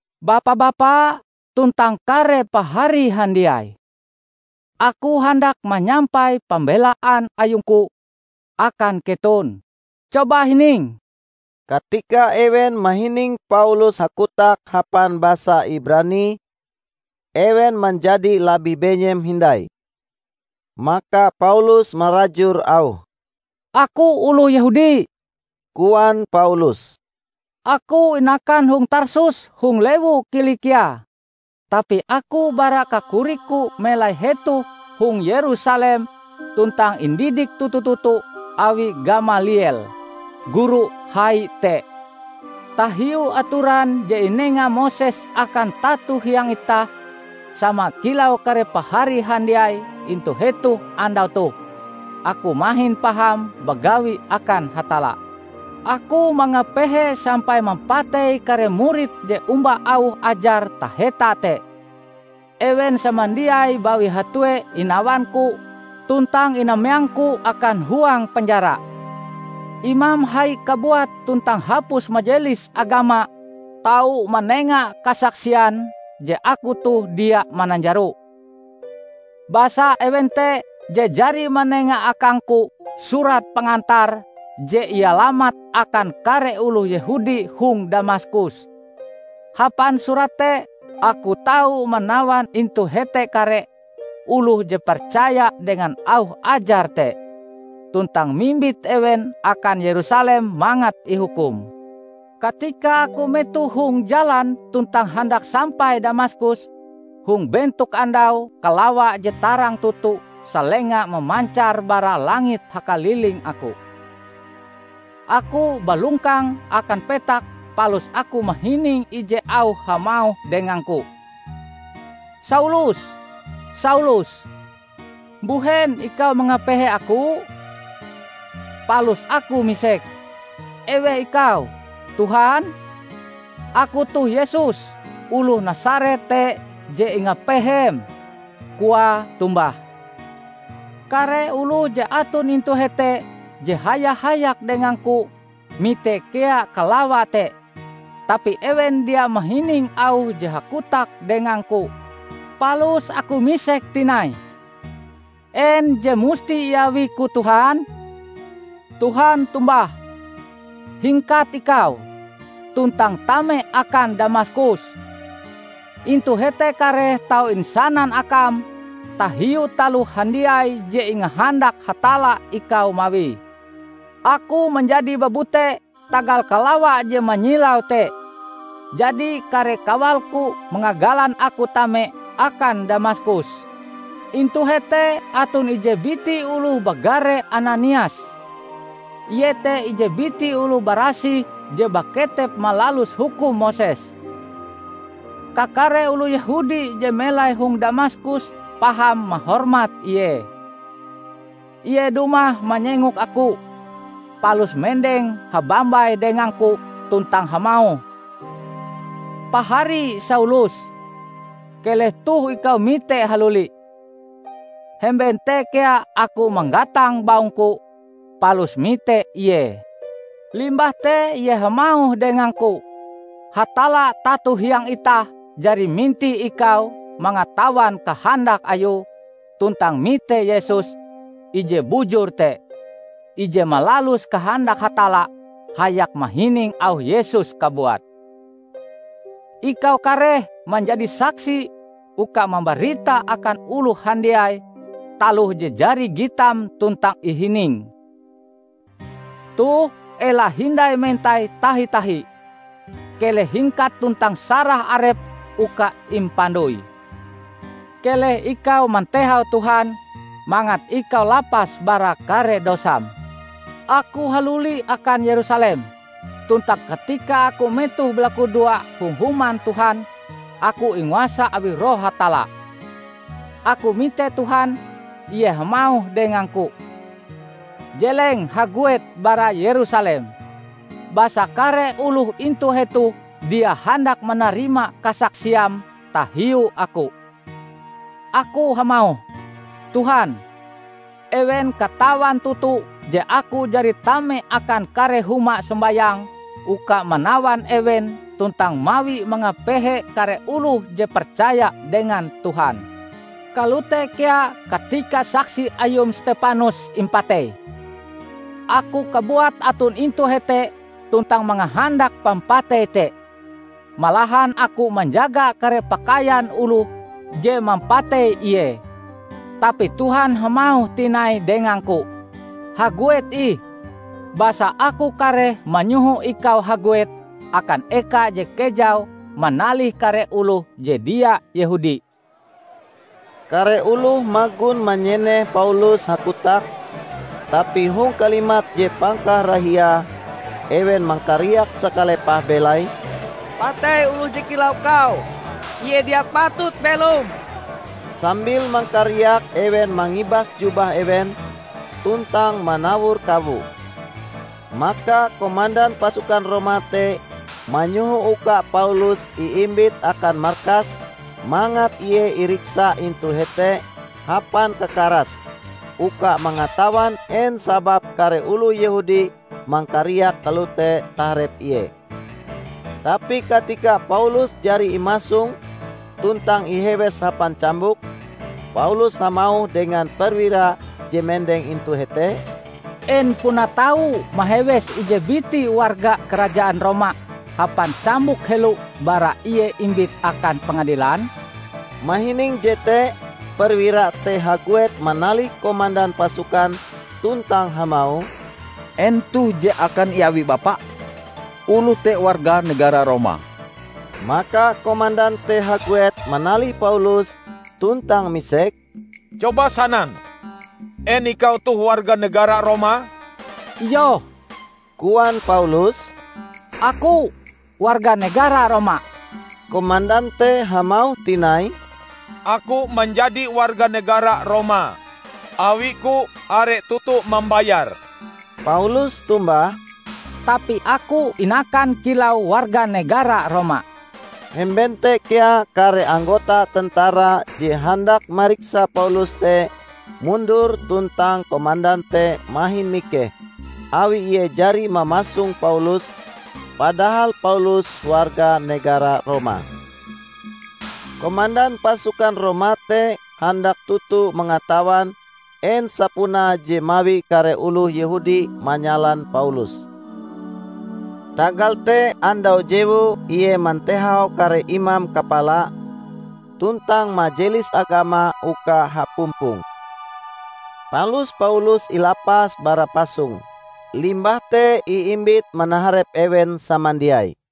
"Bapa-bapa tuntang kare pahari handiai! Aku handak manyampai pambelaan ayungku akan keton. Coba hining!" Katika ewen mahining Paulus hakotak hapan basa Ibrani, ewen manjadi labih benyem hindai. Maka Paulus marajur auhe. "Aku oloh Yehudi," koan Paulus. "Aku inakan hong Tarsus hong lewu Kilikia, tapi aku bara kakorikku melai hetoh hong Yerusalem tuntang indidik toto-toto awi Gamaliel, guru hai te, tahiu atoran je inenga Moses akan tato hiang itah. Sama kilau kare pahari handiai intu hetoh andau toh, aku mahin paham bagawi akan Hatalla. Aku mangapehe sampai mampatei kare murid je omba auh ajar taheta te. Ewen samandiai bawi hatue inawangku tuntang inameangku akan huang penjara. Imam hai kabuat tuntang hapus Majelis Agama tau manenga kasaksian je aku toh dia mananjaro. Basa ewen te je jari manenga akangku surat pengantar je ialamat akan kare oloh Yehudi hong Damaskus. Hapan surat te aku tau manawan intu hete kare oloh je percaya dengan auh ajar te, tuntang mimbit ewen akan Yerusalem mangat ihukum." "Katika aku metoh hong jalan tuntang handak sampai Damaskus, hong bentok andau, kalawa je tarang toto salenga mamancar bara langit hakaliling aku. Aku balongkang akan petak palus aku mahining ije auh hamauh dengangku, 'Saulus, Saulus! Mbuhen ikau mangapehe Aku?' Palus aku misek, 'Eweh Ikau, Tuhan?' 'Aku toh Yesus oloh Nasaret te je ingapehem,' koae tombah. Kare oloh je aton intu hete je haya-hayak dengangku, mite kea kalawa te, tapi ewen dia mahining auh je hakotak dengangku. Palus aku misek tinai, 'En je musti iawiku Tuhan?' Tuhan tombah, 'Hingkat ikau, tuntang tame akan Damaskus. Intu hete kareh tau insanan akam tahiu taloh handiai je ingahandak Hatalla ikau mawie.' Aku manjadi babute tagal kalawa je manyilau te. Jadi kare kawalku mangagalan aku tame akan Damaskus. Intu hete aton ije biti oloh bagare Ananias. Ie te ije biti oloh barasih je baketep malalus hukum Moses. Kakare oloh Yehudi je melai hong Damaskus paham mahormat ie. Ie dumah manyengok aku, palus mendeng habambai dengangku tuntang hamauh, 'Pahari Saulus, keleh toh ikau mite haluli!' Hemben te kea aku manggatang baungku, palus mite ie. Limbah te ie hamauh dengangku, 'Hatalla tato hiang itah jari mintih ikau mangatawan kahandak Ayue, tuntang mite Yesus, Ije Bujur te, ije malalus kahandak Hatalla hayak mahining auh Yesus kabuat. Ikau kareh manjadi saksi uka mambarita akan oloh handiai taloh je jari gitam tuntang ihiningm. Toh ela hindai mentai tahi-tahi. Keleh hingkat tuntang sarah arepm uka impandoi. Keleh ikau mantehau Tuhan mangat ikau lapas bara kare dosam.' " "Aku haluli akan Yerusalem, tuntang katika aku metoh balakudoa hong Human Tuhan, aku inguasa awi Roh Hatalla. Aku mite Tuhan; ie hamauh dengangku, 'Jeleng haguet bara Yerusalem, basa kare oloh intu hetoh dia handak manarima kasaksiam tahiu Aku.' Aku hamauh, 'Tuhan, ewen katawan toto je aku jari tame akan kare huma sombayang uka manawan ewen tuntang mawi mangapehe kare oloh je percaya dengan Tuhan. Kalote kea katika saksi Ayum Stepanus impatei, aku kabuat aton intu hete tuntang mangahandak pampatei te. Malahan aku manjaga kare pakaian oloh je mampatei ie.' Tapi Tuhan hamauh tinai dengangku, 'Haguet ih, basa Aku kareh manyoho ikau haguet akan eka je kejau manalih kare oloh je dia Yehudi.' " Kare oloh magon manyeneh Paulus hakotak, tapi hong kalimat je pangkarahiae ewen mangkariak sakalepah belaie, "Patei oloh je kilau kau. Ie dia patut belom!" Sambil mangkariak ewen mangibas jubah ewen, tuntang manawor kawo. Maka komandan pasukan Roma te manyoho uka Paulus iimbit akan markas mangat ie iriksa intu hete hapan kakaras uka mangatawan en sababe kare oloh Yehudi mangkariak kalote taharep ie. Tapi katika Paulus jari imasong tuntang ihewes hapan cambuk, Paulus hamauh dengan perwira je mendeng intu hete, "En puna tau mahewes ije biti warga karajaan Roma hapan cambuk helo bara ie imbit akan pengadilan?" Mahining jete perwira te haguet manalih komandan pasukan tuntang hamauh, "En toh je akan iawi bapa? Oloh te warga negara Roma!" Maka komandan te haguet manalih Paulus tuntang misek, "Coba sanan, en ikau toh warga negara Roma!" "Iyoh," koan Paulus, "aku warga negara Roma." Komandan te hamauh tinai, "Aku manjadi warga negara Roma awiku are toto mambayar!" Paulus tombah, "Tapi aku inakan kilau warga negara Roma." Hemben te kea kare anggota tentara je handak mariksa Paulus te mundur tuntang komandan te mahin mikeh awi ie jari mamasong Paulus, padahal Paulus warga negara Roma. Komandan pasukan Roma te handak toto mangatawan en sapunae je mawi kare oloh Yehudi manyalan Paulus. Tagal te andau jewue ie mantehau kare imam kapala tuntang Majelis Agama uka hapumpong. Palus Paulus ilapas bara pasonge, limbah te iimbit manaharep ewen samandiai.